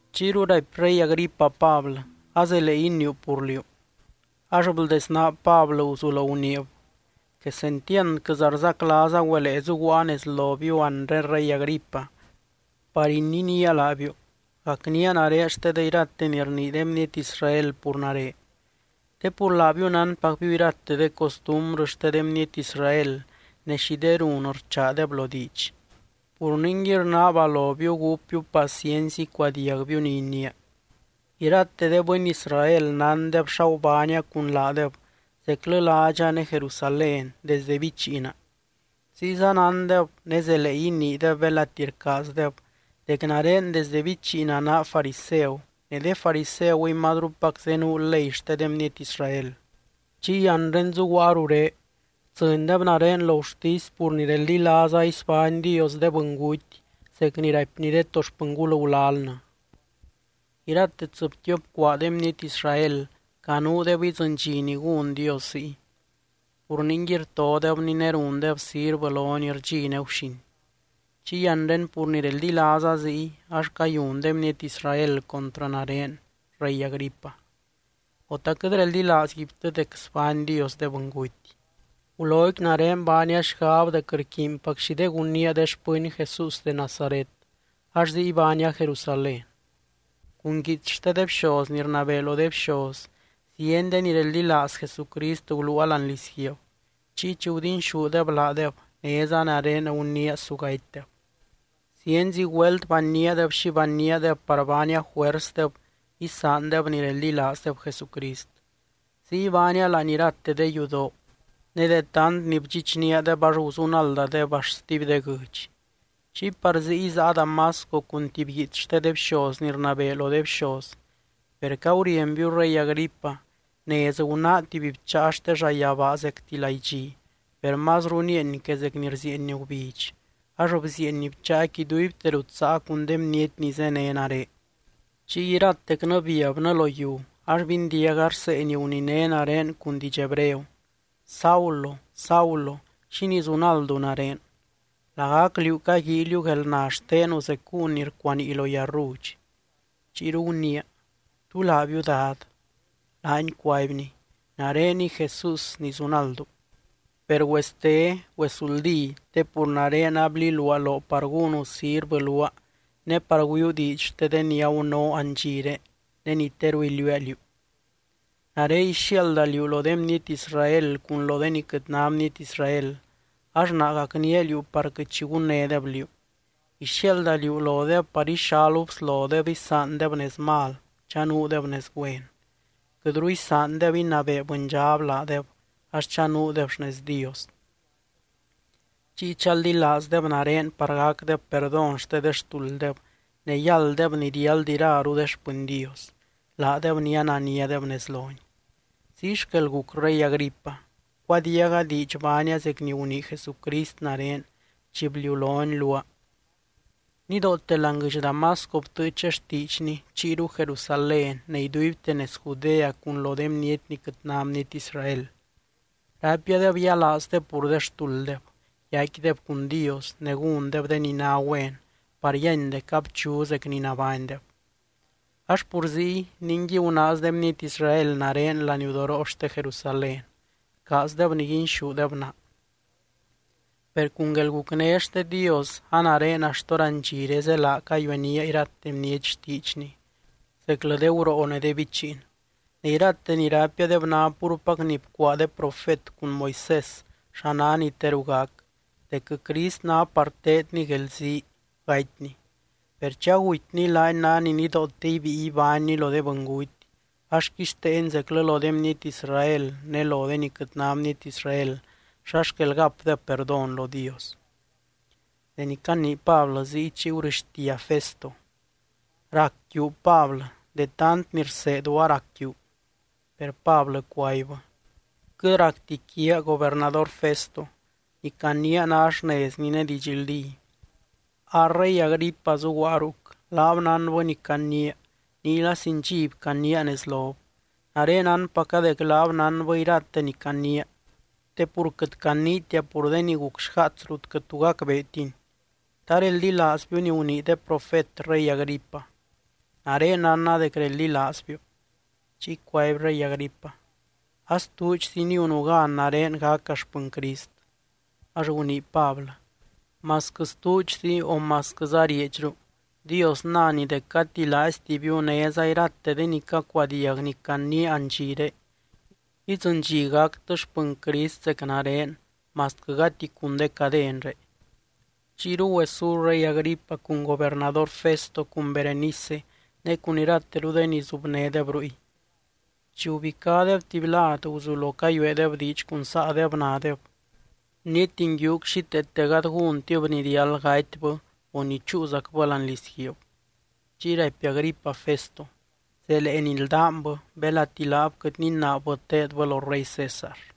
Chiyru raipy rey Agripa Pablɨ: —Azelee iniiu pur liú. Ax bldesnaa Pablɨ guzulo guniib: —Quesentiandquɨza rzaclaaza güelee zuguaa nez lobiu anre rey Agripa, par ininía laabiu, gacnía nare xte de irate ni rnii de bniety Israel pur nare. Te pur laabiu nánpacbiu irate de costumbrɨ xte de bniety Israel, ne xi de run rchaadeb lo diidx. Pur ningui rnaaba lobiu gúpbiu paciency icuadiagbiu ni iniia. ’Irate de bɨny Israel nándeb xa gubánia cun laadeb zeclɨ ládxa ne Jerusalén, desde bichiina. Ziyza nándeb, ne zelee iniideb belati rcaazdeb, dec nare desdɨ bichiina naa fariseu, ne de fariseuy mazrupac zenuu ley xte de bniety Israel. Chiy anre zuguaa ruré, btsɨndeb nare lo gurtisy pur ni reldilaaza isbány Dios de bɨnguty zec ni raipny de to xpɨngul gulalnɨ. Irate tsɨbtiop cuaa de bniety Israel canuudeb idzɨny dxi ni gún Dios ziy, pur ningui rtodebny ne rundeb sirvɨ lony rdxi ne guxin. Chiy anre pur ni reldilaaza ziy ax cayun de bniety Israel contrɨ nare, rey Agripa. O, ¿ta quɨt reldilaazguibtɨ dec sbány Dios de bɨnguty? ’Guloqui nare baania xgab dec rquiinpac xi de gunnía de xpɨny Jesús de Nazaret, ax ziy baania Jerusalén. Cun guiits xte de bxoz ni rnabee lo de bxoz, zieny de ni reldilaaz Jesucrist guluua láani lizguiib. Chiy chi gudinxúdeb laadeb, néza nare guniia su gatydeb. Zienzi güelt banníadeb xi banníadeb par baania juersdeb isaandeb ni reldilaazdeb Jesucrist. Ziy baania láani irate de yudoo, ne de tant ni bdxichníadeb ax guzunaldadeb axt stuby de guɨdx. ’Chiy par ziy záa Damasco, cun tuby guiits xte de bxoz ni rnabee lo de bxoz. Per caurienbiu rey Agripa, nez gunáa tuby bcháa xte llayabaa zecti laidxi, per mazru nieeny que zec ni rzieeny gubidx, ax bzieeny bcháaqui iduibte rut záa cun de bniety ni zéne nare. Chiy iratecnɨ biabnɨ lo yiu, ax bindiaga rsee ni guniné nare cun diidx hebreo: “Saulo, Saulo, ¿xínii zunaldu nare? Lagac liú caguíiliu guelna xtenu zec gúun ni rcuanii lo yarrudx.” Chiyru guniia: “¿Tú laabiu, Dad?” Laany cuaibny: “Nareniy Jesús, ni zunaldu. Per güeste, güezuldí, te pur nare abliluaa loo par gúnu sirvɨ luaa ne par güiuu diidx xte ni agunoo andxiré ne ni teru iliuua liú. Nare ixiaalda liú lo de bniety Israel cun lo de ni quɨt ná bniety Israel, ax naa gacnía liú par quɨt xi gunnédeb liú. Ixiaalda liú lodeb par ixalu bslodeb isaandeb nez mal, chanuudeb nez güen. Quɨtru isaandeb inabee bɨndxab laadeb, ax chanuudeb xnez Dios. Chiy chaldilaazdeb nare par gacdeb perdón xte de xtulddeb ne yálddeb ni riáld iraru de xpɨny Dios, laadeb ni ananiadeb nez lony.” ’Ziy xquel guc, rey Agripa, bcuadiaga diidx baania zec ni gunii Jesucrist nare chi bliulony luaa. Nidoote láani guɨdx Damasco btɨɨcha xtiidxny, chiyru Jerusalén ne iduibte nez Judea cun lo de bniety ni quɨt ná bniety Israel. Raipiadeb yialaazdeb pur de xtulddeb, yaicquideb cun Dios ne gúndeb de ni ná güen par yíany dec abchu zec ni nabánydeb. Ax pur ziy, ningui gunaaz de bniety Israel nare laniudoroo xte Jerusalén, rcaazdeb niguinxúdeb naa. Per cun guelgucné xte Dios a nare axt hórandxire zélaa cayuenía irate bniety xtiidxny, zeclɨ de guroo ne de bichiin. Ne irate ni raipiadeb ná púrpac ni bcuaa de profet cun Moisés xa ná ni teru gac, dec Crist ná par teedny guelzii, gatyny. Per chi agutyny laany ná ni nidoote ibíi ibánny lo de bɨnguty, ax quixteeny zeclɨ lo de bniety Israel ne lo de ni quɨt ná bniety Israel xa xquel gapdeb perdón lo Dios. Deni canii Pablɨ ziy, chiy gurɨxtia Festo: —¡Rac quiu, Pablɨ! De tant ni rseedu arac quiu. Per Pablɨ cuaibbɨ: —Quɨt racti quiaa, gobernador Festo. Ni caniia ná xnezni ne didxldí. A rey Agripa zuguaa ruc, laab nánbɨ ni caniia, niyla sin dxiby caniia nez lob. Nare nánpaca dec laab nánbɨ irate ni caniia, te pur quɨt caniitia pur de ni guc xgaats rut quɨt tu gacbeetini. ¿Ta reldilaazbiu ni gunii de profet, rey Agripa? Nare nánna dec reldilaazbiu. Chiy cuaby rey Agripa: —A stuudxzi niunu gan nare gaca xpɨny Crist. Ax gunii Pablɨ: —Masquɨ stuudxzi o masquɨza rieedxru, Dios nany dec gati laaiztibiu, néza irate de ni cacuadiag ni caniia andxiré, idzɨny dxi gactɨ xpɨny Crist zec nare masquɨ gati cun de cadenré. Chiyru güesú rey Agripa cun gobernador Festo cun Berenice ne cun irateru de ni zubnédeb ruy. Chi gubicádeb tuby lad guzulo cayueedeb diidx cun saadeb, nadeb: —Bniety nguiuc xíteete gady gúntib ni riáld gatybɨ, o ni chúuzacbɨ láani lizguiib. Chiy raipy Agripa Festo: —Zelee nildánbɨ, belati laab quɨt ninaabbɨ teedbɨ lo rey César.